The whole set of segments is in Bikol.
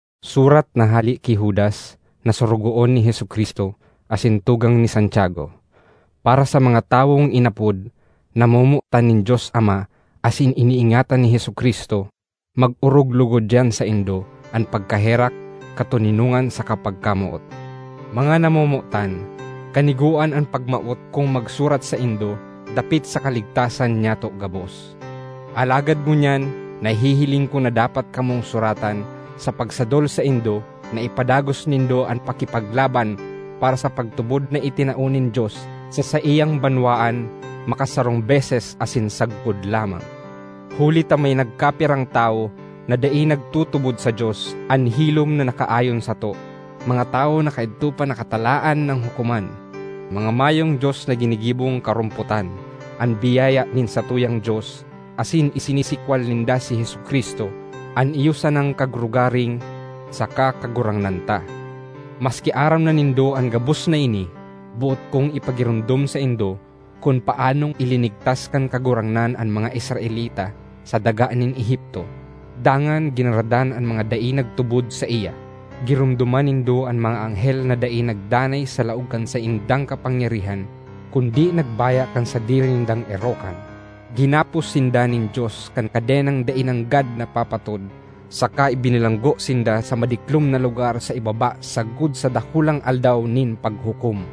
Surat na hale ki Judas na sorogoon ni Jesu-Cristo, asin tugang ni Santiago. Para sa mga tawong inapod, namomotan nin Dios Ama asin iniingatan ni Jesu-Cristo: Mag-orog logod diyan saindo an pagkaherak, katoninongan saka pagkamoot. Mga namomotan, kanigoan an pagmawot kong magsurat saindo dapit sa kaligtasan nyato gabos. Alagad ngunyan nahihiling ko na dapat kamong suratan sa pagsadol saindo na ipadagos nindo an pakipaglaban para sa pagtubod na itinao nin Dios sa saiyang banwaan makasarong beses asin sagkod lamang. Huli ta may nagkapirang tawo na dai nagtutubod sa Dios an hilom na nakaayon sato, mga tawo na kaidto pa nakatalaan nang hukoman, mga mayong dios na ginigibong karompotan an biyaya nin satuyang Dios, asin isinisikwal ninda si Jesu-Cristo, an iyo sanang Kagrogaring saka Kagurangnan ta. Maski aram na nindo an gabos na ini, boot kong ipagiromdom saindo kun paanong ilinigtas kan Kagurangnan an mga Israelita sa daga nin Egipto, dangan ginaradan an mga dai nagtubod saiya. Giromdoma nindo an mga anghel na dai nagdanay sa laog kan saindang kapangyarihan kundi nagbaya kan sadiri nindang erokan: ginapos sinda nin Dios kan kadenang dai nanggad napapatod saka ibinilanggo sinda sa madiklom na lugar sa ibaba sagkod sa dakulang Aldaw nin Paghukom.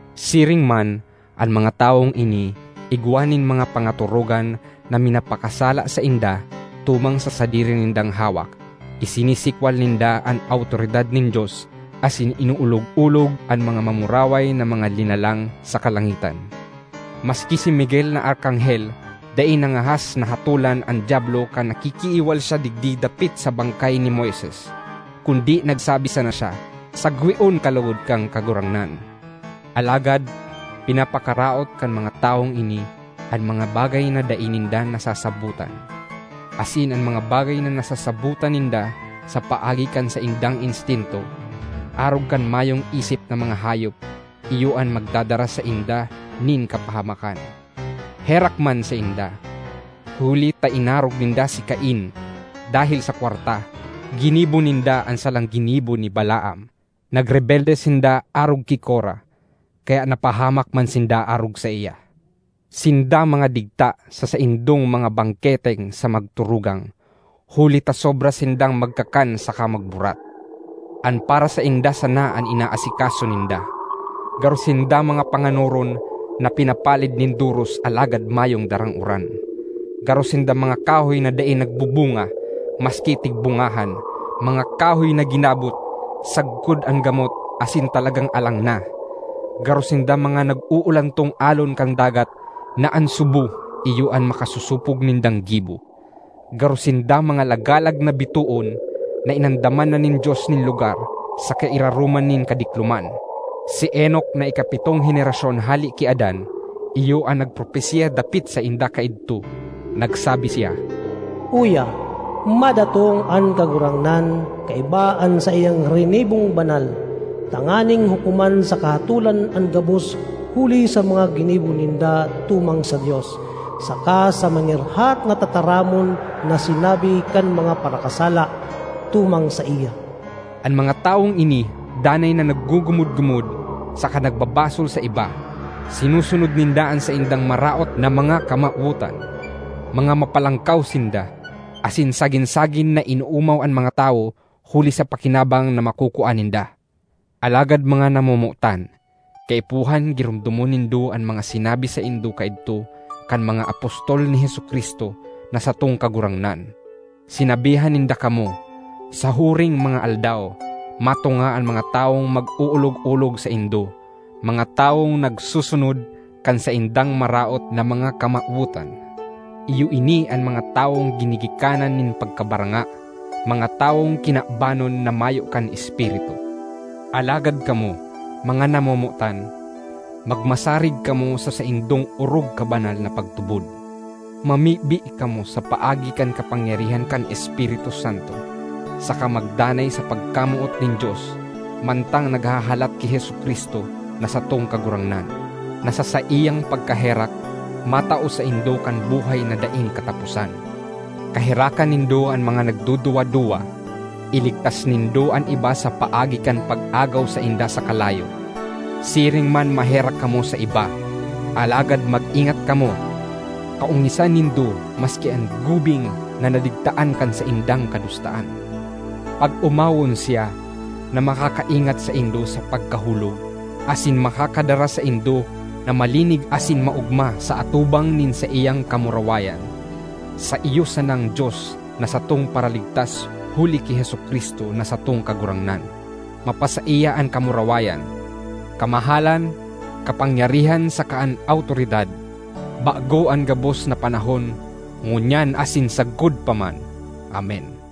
Siring man, an mga tawong ini igwa nin mga pangatorogan na minapakasala sainda tumang sa sadiri nindang hawak, isinisikwal ninda an awtoridad nin Dios, asin inoolog-olog an mga mamuraway na mga linalang sa kalangitan. Maski si Miguel na Arkanghel dai nangahas na hatolan an Diablo kan nakikiiwal siya digdi dapit sa bangkay ni Moises, kundi nagsabi sana siya, “Sagweon ka logod kan Kagurangnan!” Alagad pinapakaraot kan mga tawong ini an mga bagay na dai ninda nasasabotan. Asin an mga bagay na nasasabotan ninda sa paagi kan saindang instinto, arog kan mayong isip na mga hayop, iyo an magdadara sainda nin kapahamakan. Herak man sainda! Huli ta inarog ninda si Cain; dahel sa kwarta, ginibo ninda an salang ginibo ni Balaam. Nagrebelde sinda arog ki Kora, kaya napahamak man sinda arog saiya. Sinda mga digta sa saindong mga bangketeng sa magturugang, huli ta sobra sindang magkakan saka magburat. An para sainda sana an inaasikaso ninda. Garo sinda mga panganoron na pinapalid nin doros alagad mayong darang uran. Garo sinda mga kahoy na dai nagbubunga, maski tigbungahan; mga kahoy na ginabot sagkod an gamot asin talagang alang na. Garo sinda mga nag-uulantong alon kan dagat na an subo iyo an makasosopog nindang gibo. Garo sinda mga lagalag na bitoon na inandaman na nin Dios nin lugar sa kairaroman nin kadikloman. Si Enoc na ikapitong henerasyon hale ki Adan, iyo an nagpropesiya dapit sainda kaidto. Nagsabi siya, “Uya, madatong an Kagurangnan kaiba an saiyang rinibong banal, tanganing hukoman saka hatolan an gabos huli sa mga ginibo ninda tumang sa Dios, saka sa mangirhat na tataramon na sinabi kan mga parakasala tumang saiya!” An mga tawong ini danay na naggugumod-gumod saka nagbabasol sa iba; sinusunod ninda an saindang maraot na mga kamawotan; mga mapalangkaw sinda, asin sagin-sagin na inoomaw an mga tawo huli sa pakinabang na makukua ninda. Alagad mga namomotan, kaipuhan giromdomon nindo an mga sinabi saindo kaidto kan mga apostol ni Jesu-Cristo na satong Kagurangnan. Sinabihan ninda kamo, “Sa huring mga aldaw, matunga an mga tawong mag-oolog-olog saindo; mga tawong nagsusunod kan saindang maraot na mga kamawotan.” Iyo ini an mga tawong ginigikanan nin pagkabaranga, mga tawong kinabanon na mayo kan Espiritu. Alagad kamo, mga namomotan, magmasarig kamo sa saindong orog kabanal na pagtubod. Mamibi kamo sa paagi kan kapangyarihan kan Espiritu Santo, saka magdanay sa pagkamoot nin Dios, mantang naghahalat ki Jesu-Cristo na satong Kagurangnan, na sa saiyang pagkaherak, matao saindo kan buhay na daing kataposan. Kaherakan nindo an mga nagduduwa-duwa; iligtas nindo an iba sa paagi kan pag-agaw sainda sa kalayo. Siring man maherak kamo sa iba, alagad mag-ingat kamo; kaongisan nindo maski an gubing na nadigtaan kan saindang kadustaan. Pag-omawon siya na makakaingat saindo sa pagkahulog, asin makakadara saindo na malinig asin maogma sa atubang nin saiyang kamurawayan, sa iyo sanang Dios na satong Paraligtas huli ki Jesu-Cristo na satong Kagurangnan, mapasaiya an kamurawayan, kamahalan, kapangyarihan saka an awtoridad, bago an gabos na panahon, ngunyan asin sagkod pa man! Amen.